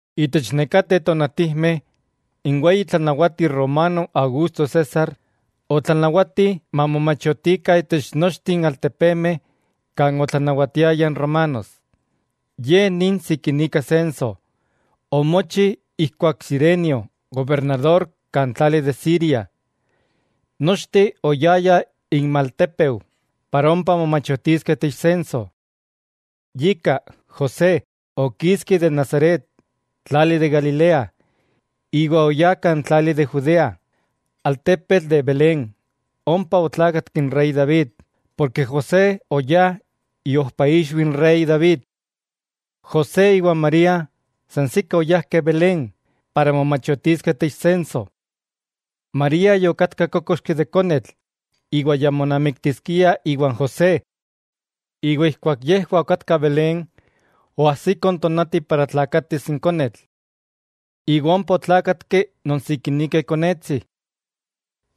Itech nekateh tonatijmeh, n weyi tlanawati romano Augusto César, otlanawati mamomachotikah itech nochteh n altepemeh kan otlanawatiaya n Romanos, ye ni n sikinika senso, omochi ijkuak Cirenio gobernador kan tlali de Siria. Nochteh oyayah inmaltépeu para ompa momachotiskeh itech senso. Yika, José okiski de Nazaret, tlali de Galilea, iwa oyá kan tlali de Judea, altepetl de Belén, ompa otlákatki n rey David, porke José oyá iojpaixwi n rey David. José iwa María sansikah oyajkeh Belén, para momachotiskeh itech senso. María yokatka kokoxki de konetl iwa ya monamiktiskia iwan José. Ijkuak yejwah okatkah Belén, oajsiko n tonati para tlakatis n konetl. Iwa ompa otlákatki non sikinika ikonetsi.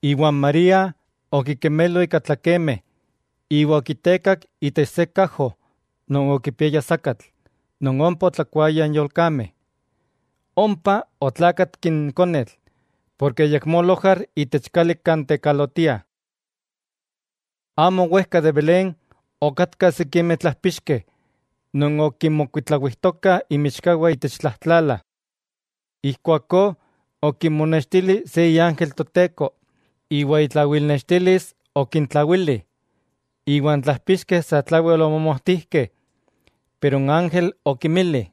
Iwa n María okikemelo ika tlakemeh iwa okitekak itech se kajo non okipiaya sakatl non ompa otlakuayah n yolkameh. Ompa otlákatki n konetl porke ayakmó lojar itech kali kan tekalotiah. Amo wejka de Belén okatkah sikimeh tlajpixkeh non okinmokuitlawijtokah inmichkawah itech tlajtlala. Ijkuakó okinmonextili se iángel Toteko, iwa itlawilnextilis okintlawili, iwa n tlájpixkeh satlawel omomojtijkeh. Pero n ángel okinmili: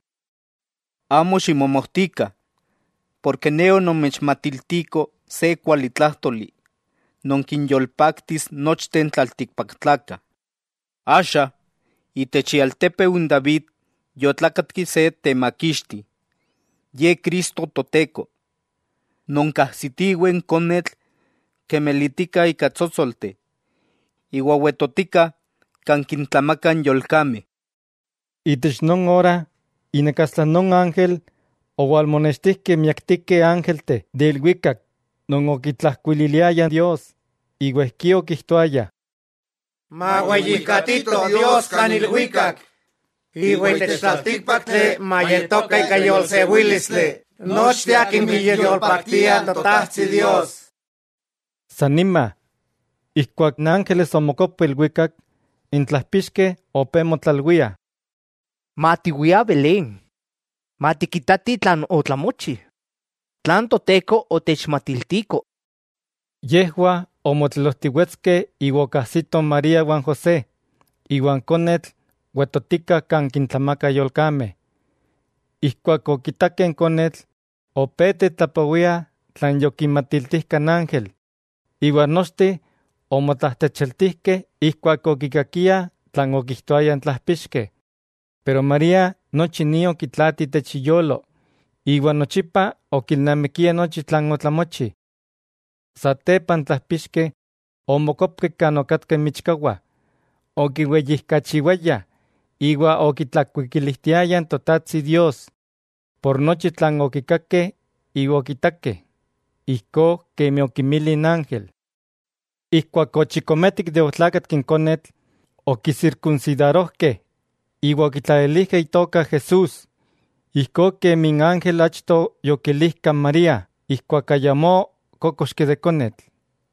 —Amo ximomojtikah, porke ne onomechmatiltiko se kualitlájtoli, non kinyolpaktis nochteh n tlaltikpaktlakah. Axa itech ialtépeu n David yotlákatki se Temakixti, Ye Cristo Toteko. Nonkajsitiweh n konetl kemelitika ika tsótsolteh, iwa wetotika kan kintlamakah n yolkameh. Itech non ora inakastla non ángel, owalmonextijkeh miaktikeh ángelteh de ilwikak non okitlakuikiliayah Dios iwa ijkí okijtoayah: ¡Maweyijkatito Dios kan ilwikak, iwa itech tlaltíkpaktli mayetokah ika yolsewílistli nochteh akimeh kiyolpaktiah n Totajtsi Dios! San nima, ijkuak n ángeles omokopkeh ilwikak, n tlajpixkeh opé motlalwiah: —Matiwiah Belén, matikitatih tlan otlamochi, tlan Toteko otechmatiltiko. Yejwah omotlelojtiwetskeh iwa okajsitoh n María iwa n José, iwa n konetl wetotika kan kintlamakah n yolkameh. Ijkuak okitakeh n konetl, opé tetlapowiah tlan yokinmatiltijka n ángel, iwa nochteh omotlajtlachialtijkeh ijkuak okikakiah tlan okijtoayah n tlajpixkeh. Pero María nochi ni okitlaati itech iyolo, iwa nochipa okilnamikia nochi tlan otlamochi. Satepa n tlajpixkeh omokopkeh kan okatkah inmichkawah, okiweyijkachiwayah iwa okitlakuikilijtiayah n Totajtsi Dios por nochi tlan okikakeh iwa okitakeh, ijkó kemi okinmili n ángel. Ijkuak ochikometik de otlákatki n konetl, okisirkunsidarojkeh, iwa okitlalilijkeh itoka JESÚS, ijkó kemi n ángel achto yokilijka n María ijkuak ayamó kókoxki de konetl.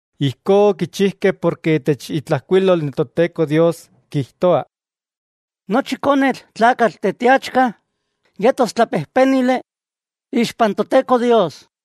Ijkó okichijkeh porke itech itlajkuilol n Toteko Dios kijtoa: “Nochi konetl tlakatl teteachka, yetos tlapejpénili ixpan Toteko Dios.”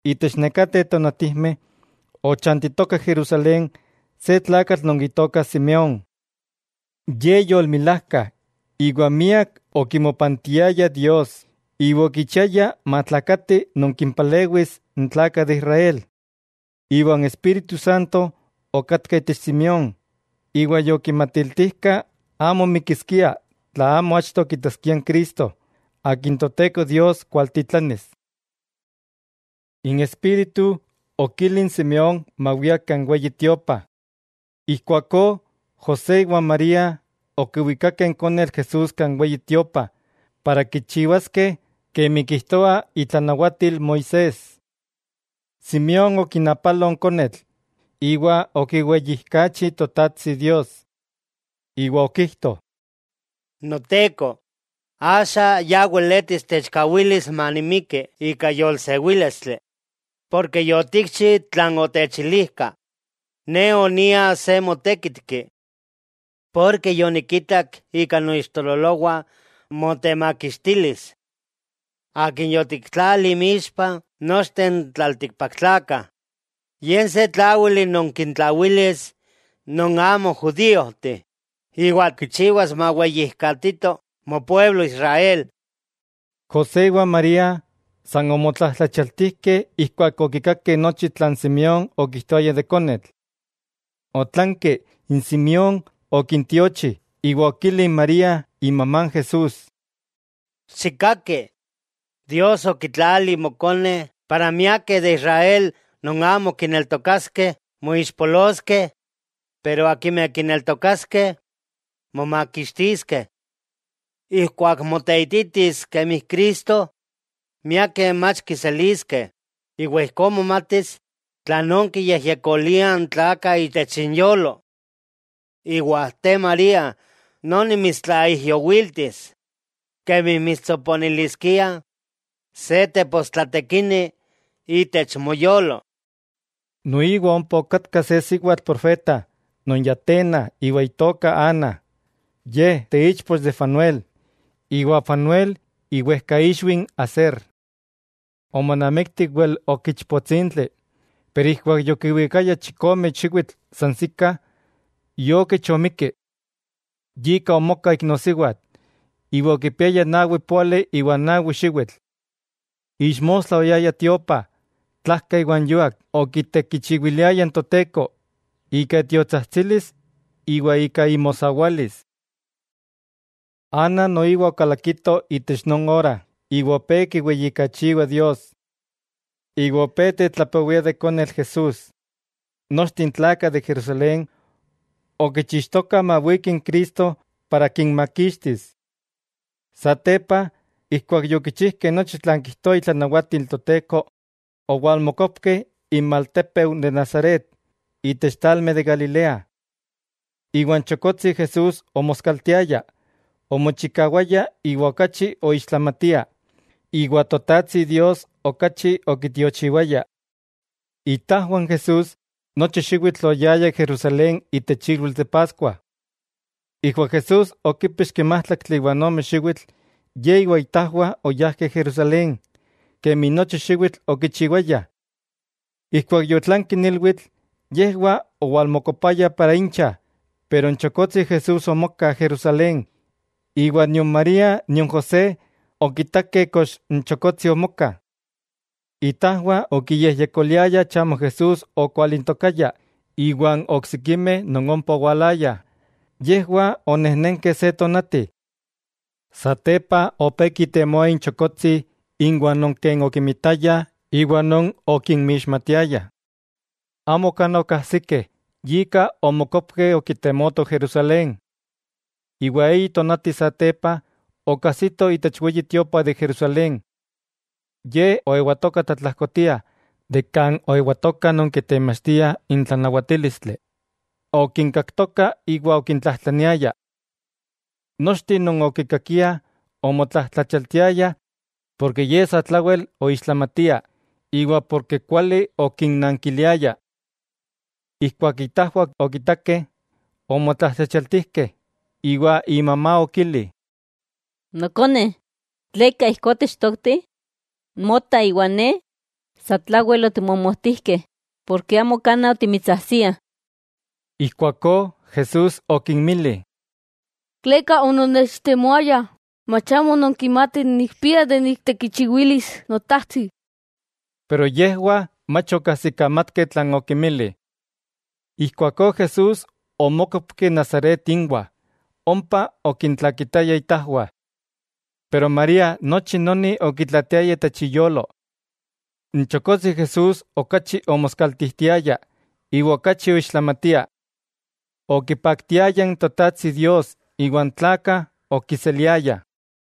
Itech nekateh tonatijmeh, ochantitoka Jerusalén se tlakatl non itoka Simeón. Ye yolmilajka iwa miak okimopantiaya Dios iwa okichiaya matlakati non kimpalewis n tlakah de Israel. Iwa n Espíritu Santo okatka itech Simeón, iwa yokimatiltijka amo mikiskia tla amo achto kitaskia n Cristo, Akin Toteko Dios kualtitlanis. N Espíritu okili n Simeón mawia kan Weyi Tiopa. Ijkuakó José iwa n María okiwikakeh n konetl Jesús kan Weyi Tiopa para kichiwaskeh kemi kijtoa itlanawatil Moisés. Simeón okinapalo n konetl iwa okiweyijkachi Totajtsi Dios, iwa okijto: Noteko, axa ya weletis techkawilis manimiki ika yolsewílistli, porke yotikchi tlan otechilijka, ne onia se motékitki. Ken yonikitak ika noixtololowah motemakixtilis, Akin yotiktlali inmixpah nochteh n tlaltikpaktlakah. Ye se tláwili non kintlawilis non amo judíojteh, iwa kichiwas maweyijkatito mopueblo Israel. José iwa n María san omotlajtlachialtijkeh ijkuak okikakeh nochi tlan Simeón okijtoaya de n konetl. Otlanki n Simeón okintiochi iwa okili n María imamá n Jesús: —¡Xikkaki! Dios okitlali mokone para miakeh de Israel non amo kineltokaskeh moixpoloskeh pero akimeh kineltokaskeh, momakixtiskeh. Ijkuak moteititis kemi Cristo miakeh mach kiseliskeh, iwa ijkó momatis tlanón kiyejyekoliah n tlakah itech inyolo. Iwa te María noni mitstlaijyowiltis, kemi mitstsoponiliskia se tepostlatekini itech moyolo. Noiwa ompa okatka se siwatl profeta non ya tena iwa itoka Ana, ye teichpoch de Fanuel, iwa Fanuel iwejkaixwi n Aser. Ana omonamikti wel ok ichpotsintli, pero ijkuak yokiwikayah chikome xiwitl sansikah, iokich omikki. Yika omoka iknosiwatl, iwa yokipiaya nawi póali iwa n nawi xiwitl. Ixmostla oyaya tiopa, tlajka iwa n yuak okitekichiwiliaya n Toteko, ika itiotsajtsilis iwa ika imosawalis. Ana noiwa okalakito itech non ora iwa opé kiweyijkachiwa Dios. Iwa opé tetlapowia de n konetl Jesús, nochteh n tlakah de Jerusalén okichixtokah mawiki n Cristo para kinmakixtis. Satepa, ijkuak yokichijkeh nochi tlan kijtoa itlanawatil n Toteko, owalmokopkeh inmaltépeu de Nazaret, itech tlalmeh de Galilea. Iwa n chokotsi Jesús omoskaltiaya, omochikawaya iwa okachi oixtlamatia, iwa Totajtsi Dios okachi okitiochiwaya. Itajwah n Jesús nochi xiwitl oyayah Jerusalén itech ilwitl de Paskua. Ijkuak Jesús okípixki májtlaktli iwa ome xiwitl, Ye iwa itajwah oyajkeh Jerusalén, kemi nochi xiwitl okichiwayah. Ijkuak yotlanki n ilwitl, yejwah owalmokopayah para incha, pero n chokotsi Jesús omoka Jerusalén, iwa nion María nion José okitakeh kox n chokotsi omoka. Itajwah okiyejyekoliayah chamo Jesús okwalintokaya iwan oksikimeh non ompa owalayah, yejwah onejnenkeh se tonati. Satepa opé kitemoah inchokotsi inwah non ken okinmitayah iwa non okinmixmatiayah, amo kanaj okajsikeh, yika omokopkeh okitemotoh Jerusalén. Iwa eyi tonati satepa, okajsitoh itech Weyi Tiopa de Jerusalén. Ye oewatoka tlatlajkotia de kan oewatokah non kitemachtiah n tlanawatílistli, okinkaktoka iwa okintlatlajtlaniaya. Nochteh non okikakiah, omotlajtlachialtiayah porke Ye satlawel oixtlamatia, iwa porke kuali okinnankiliaya. Ijkuak itajwah okitakeh omotlajtlachialtijkeh, iwa imamá okili: —Nokone, ¿tleka ijkó otechtokti? Mota iwa ne, satlawel otimomojtijkeh, ken amo kanaj otimitsajsiah. Ijkuakó Jesús okinmili: —¿Tleka ononnechtemoayah? ¿Mach amo nonkimatih nikpia niktekichiwilis Notajtsi? Pero yejwah mach okajsikamatkeh tlan okinmili. Ijkuakó Jesús omókopki Nazaret inwah, ompa okintlakitaya itajwah. Pero María nochi noni okitlaatiaya itech iyolo. N chokotsi Jesús okachi omoskaltijtiaya, iwa okachi oixtlamatia. Okipaktiaya n Totajtsi Dios iwa n tlakah okiseliayah.